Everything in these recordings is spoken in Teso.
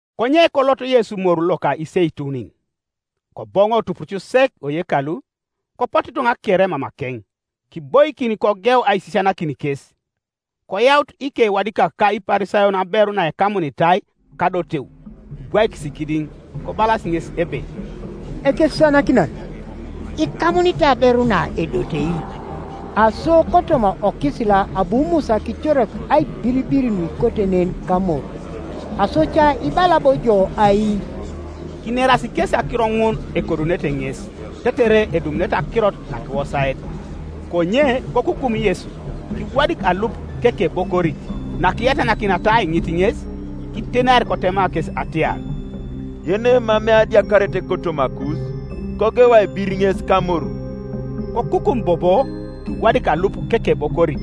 Konye kolot Yesu moru loka Iseitunin. Koboŋo tupuruc sek oyekalu, kopotu ituŋa kere mamakeŋ; kiboikin kogeu aisisianakin kes. Koyaut ikewadikak ka Iparisayon aberu naekamunitai kadoteu; kibwaikis kidiŋ, kobalas ŋes ebe, “Ekesisianakinan, ikamunitai aberu na edotei. Aso kotoma okisila abu Musa kicorak aibiribir nuikote nen kamor; aso ca ibala bo ijo ai?” Kinerasi kesi akiro ŋun ekodunete ŋes, tetere edumunete akirot nakiwosaet. Konye kokukum Yesu, kiwadik alup kekebokorit. Nakiyatanakiniata aiŋit ŋes, kitenar kotema kes atiar, “Yenemamei adiakaret kotomakus, kogeu aibir ŋes kamoru.” Kokukum bobo, kiwadik alup kekebokorit.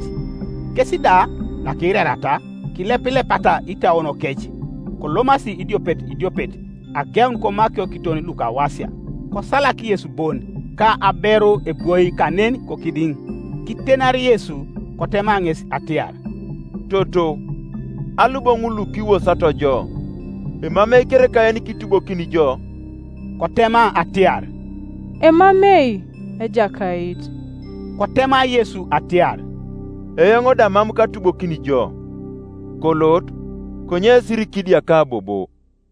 Kes da, nakiirariata, kilepilepata itauonokec, kolomasi idiopet idiopet, ageun komakio kiton lukawasia; kosalak Yesu bon, ka aberu ebwoi kanen kokidiŋ, Kitenar Yesu, kotema ŋes atiar, “Toto, alu bo ŋul lukiwosato jo? Emamei kereka yenikitubokini jo?” Kotema atiar, “Emamei, Ejakait.” Kotema Yesu atiar, “Eoŋ da mam katubokini jo: kolot; konye sirikidiaka bobo.”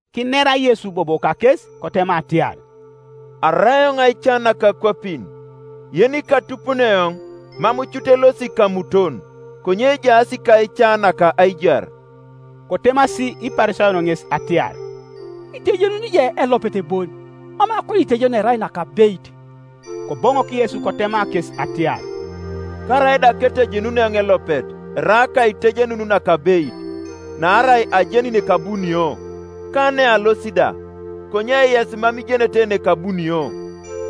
Kinera Yesu bobo kakes, kotema atiar, “Arai eoŋ aica naka akwapin; yenikatupuni eoŋ mam cut elosi kamuton, konye ejaas kaica naka aijar.” Kotemasi Iparisayon ŋes atiar, “Itejenuni ijo elopet boni mam akoniitejenun erai nakabeit.” Koboŋok Yesu kotema kes atiar, “Karaida ketejenun eoŋ elopet erai akaitejenun nakabeit; naarai ajeni nekabunio, ka nealosi da; konye yes mam ijenete nekabunio,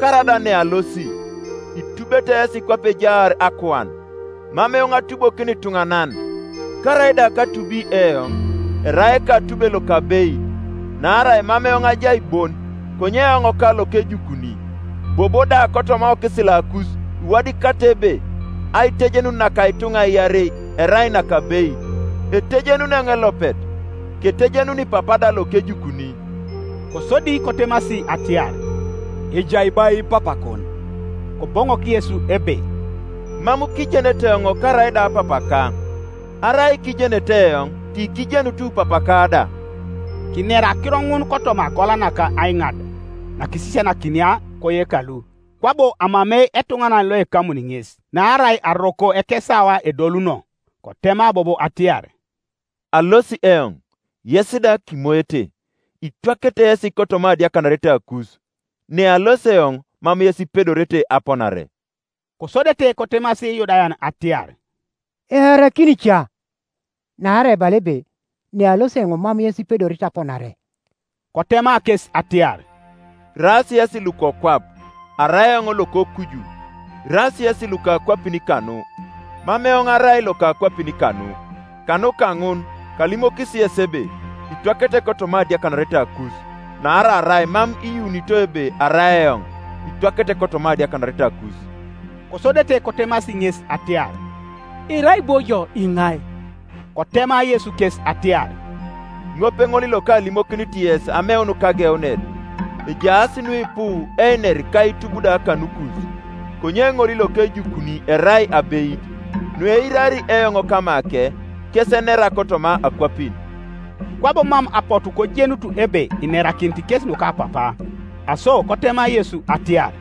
karaida nealosi. Itubete yesi kwape ejaar akuan; mam eoŋ atubokini ituŋanan. Karaida katubi eoŋ, erai ekatube lokabeit; naarai mam eoŋ ajai bon, konye eoŋ ka lokejukuni. Bobo da kotoma okisilakus iwadikatai ebe aitejenun naka ituŋa iarei erai nakabeit. Etejenuni eoŋ elopet, ketejenuni Papa da lokejukuni.” Kosodi kotemasi atiar, “Ejai bo ai Papakon?” Koboŋok Yesu ebe, “Mam kijenete eoŋ karaida Papaka; arai kiijenete eoŋ, tikijenut Papaka da.” Kinera akiro ŋun kotoma agola naka aiŋad, nakisisianakinia koyekalu; kwabo amamei etuŋanan loekamuni ŋes; naarai aroko ekesawa edoluno. Kotema bobo atiar, “Alosi eoŋ, yes da kimoete, itwakete yesi kotoma adiakanaretakus; nealosi eoŋ mam yes ipedorete aponare.” Kosodete kotemasi Iyudayan atiar, “Earakin ca, naarai ebala ebe, ‘Nealosi eoŋ mam yes ipedorete aponare’?” Kotema kes atiar, “Iraas yesi lukokwap, arai eoŋ lokokuju; iraas yesi luka akwapin kanu; mam eoŋ arai loka akwapin kanu. Kanuka ŋun kalimokis yes ebe itwakete kotoma adiakanaretakus; naarai arai mam iyuunito ebe arai eoŋ, itwakete kotoma adiakanaretakus.” Kosodete kotemasi ŋes atiar, “Irai bo ijo iŋai?” Kotema Yesu kes atiar, “Ŋopeŋol lokalimokinit yes ameun kageunet. Ejaas nuipu einer ka aitub da kanukus: konye ŋol lokejukuni erai abeit; nueirari eoŋ kamake, kes enera kotoma akwapin.” Kwabo mam apotu kojenut ebe inerakinit kes nuka Papa. Aso kotema Yesu atiar,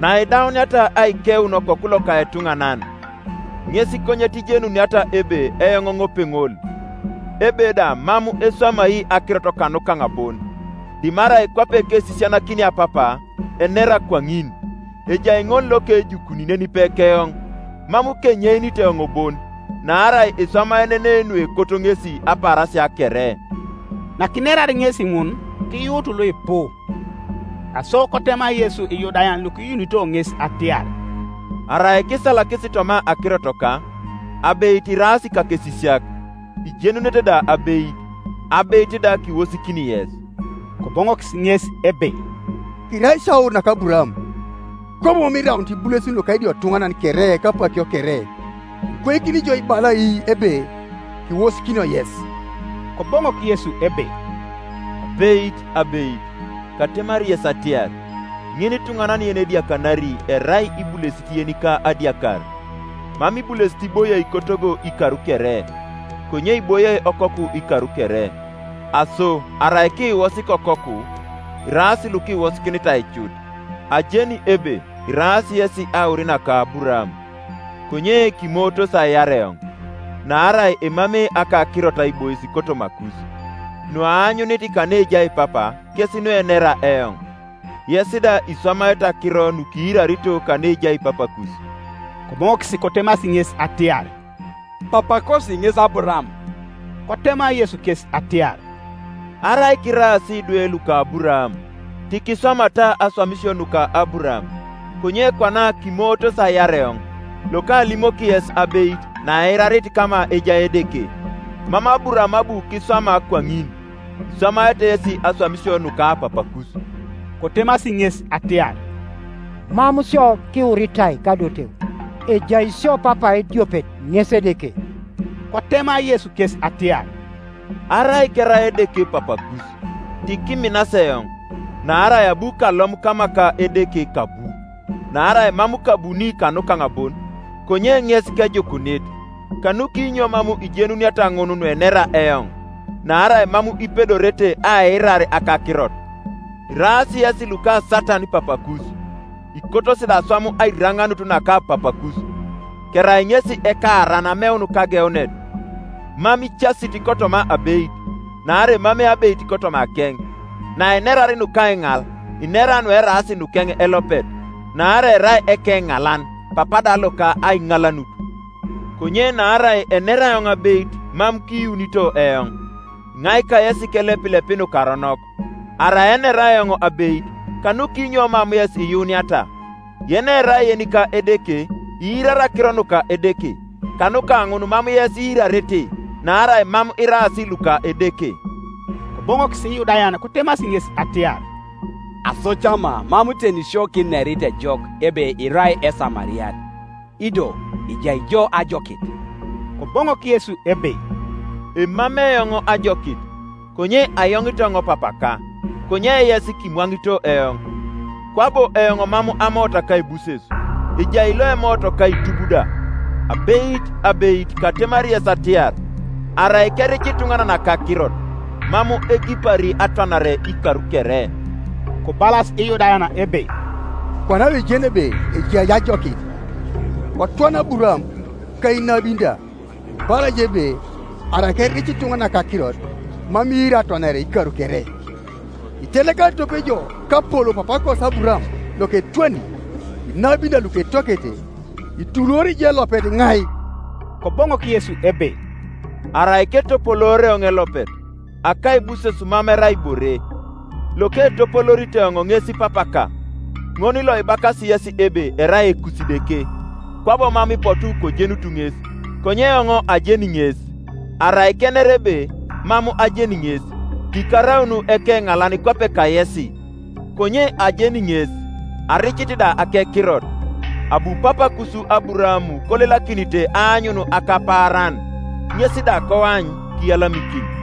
“Naidauniata aikeun Okoku loka etuŋanan, ŋes konyet ijenuniata ebe eoŋ ŋopeŋol, ebe da mam eswamai akirot kanukaŋ bon, dimarai kwape kesisianakinia Papa, enera kwaŋin. Ejai ŋol lokejukuni nenipe keoŋ; mam kenyeinit eoŋ bon; naarai eswamaenenei nuekot ŋesi apaarasia kere.” Nakinerar ŋesi ŋun, kiyuut luipu. Aso kotema Yesu lyudayan lukiyuunito ŋes atiar, “Arai kisalakis toma akirotoka, abeit iraas ikakesisiak; ijenunete da abeit, abeit da kiwosikini yes.” Koboŋokis ŋes ebe, “Kirai isio aur naka Aburaam, kwabo mam kiraunit ibulesin luka idiotuŋanan kere apakio kere: ikwaikini ijo ibala ai ebe, Kiwosikinio yes?” Koboŋok Yesu ebe, “Abeit, abeit, katemari yes atiar, Ŋinituŋanan yenediakanari erai ibulesit yenika adiakar. Mam ibulesit iboie kotogo ikar kere; konye iboie okoku ikar kere. Aso arai kiiwosik Okoku, iraas lukiwosikinitai cut. Ajeni ebe iraas yesi aur naka Aburaam; konye kimootos aiar eoŋ, naarai emamei akakirot aibois kotomakus. Nuaanyunit kaneejai Papa kes nuenera eoŋ: yes da iswamaete akiro nukiirarito kaneejai papakus.” Koboŋokis kotemasi ŋes atiar, “Papakosi ŋes Aburaam.” Kotema Yesu kes atiar, “Arai kiraas idwe luka Aburaam, tikiswamata aswamisio nuka Aburaam, Konye kwana kimootos aiar eoŋ, lokalimoki yes abeit, naeirarit kama ejai Edeke: mam Aburaam abu kiswama kwaŋin. Iswamaete yesi aswamisio nuka papakus.” Kotemasi ŋes atiar, “Mam sio kiwuritai kadoteu; ejai sio Papa ediopet, ŋes Edeke.” Kotema Yesu kes atiar, “Arai kerai Edeke Papakus, tikiminas eoŋ; naarai abu kalom kama ka Edeke kabu; naarai mam kabuni kanukaŋ bon, konye ŋes kejukunit. Kanukinyo mam ijenuniata ŋun nuenera eoŋ? Naarai mam ipedorete aiirar akakirot. Iraas yesi luka Satan papakus, ikotosi da aswam airaŋaanut naka papakus. Kerai ŋesi ekaaran ameun kageunet, mam icasit kotoma abeit, naarai emamei abeit kotomakeŋ. Nainerar nukaiŋal, inera nueraas nukeŋ elopet; naarai erai ekeŋalan, papa da loka aiŋalanut. Konye naarai enera eoŋ abeit mam kiyuunito eoŋ. Iŋai kayes kelepilepi nukaronok? Arai enera eoŋ abeit, kanukinyo mam yes iyuuniata? Yenerai yenika Edeke iirari akiro nuka Edeke; kanuka ŋun mam yes iirarete, naarai mam iraas luka Edeke.” Koboŋokis Iyudayan kotemasi ŋes atiar, “Aso ca ma mam teni sio kinerit ejok ebe irai Esamariat, ido ejai jo ajokit?” Koboŋok Yesu ebe, “Emamei eoŋ ajokit; konye ayoŋit eoŋ Papaka, konye yes kimwaŋito eoŋ. Kwabo eoŋ mam amoot akaibuses; ejai loemoot ka aitub da. Abeit, abeit, katemari yes atiar, Arai keric ituŋanan akakirot, mam egipari atwanare ikar kere.” Kobalas Iyudayan ebe, “Kwana do kijeni ebe ejai jo ajokit, Kotwana Aburaam, ka inabin da; ibala ijo ebe, ‘Arai keric ituŋanan akakirot, mam iiri atwanare ikar kere.’ Itelekarit tope ijo kapolou papaakosi Aburaam loketwani? Inabin da luketwakete; ituluori ijo elopet iŋai?” Koboŋok Yesu ebe, “Arai ketopoloor eoŋ elopet, akaibuses mam erai ibore; loketopoloorit eoŋ ŋes Papaka; ŋol loibakasi yesi ebe erai Ekusideke; kwabo mam ipotu kojenut ŋes; konye eoŋ ajeni ŋes; arai kener ebe, ‘Mam ajeni ŋes,’ tikaraun ekeŋalan kwape kayesi; konye ajeni ŋes, aricit da akekirot. Abu papaakus Aburaam kolelakinite aanyun akapaaran; ŋes da koany, kiyalamikin.”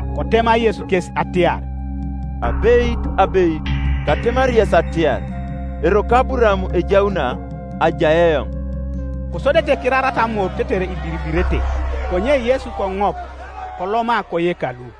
Kotema Yesu kes atiar, “Abeit, abeit, katemari yes atiar, Eroko Aburaam ejauna, ajai eoŋ.” Kosodete kirarata amor tetere ibiribirete; konye Yesu koŋop, koloma koyekalu.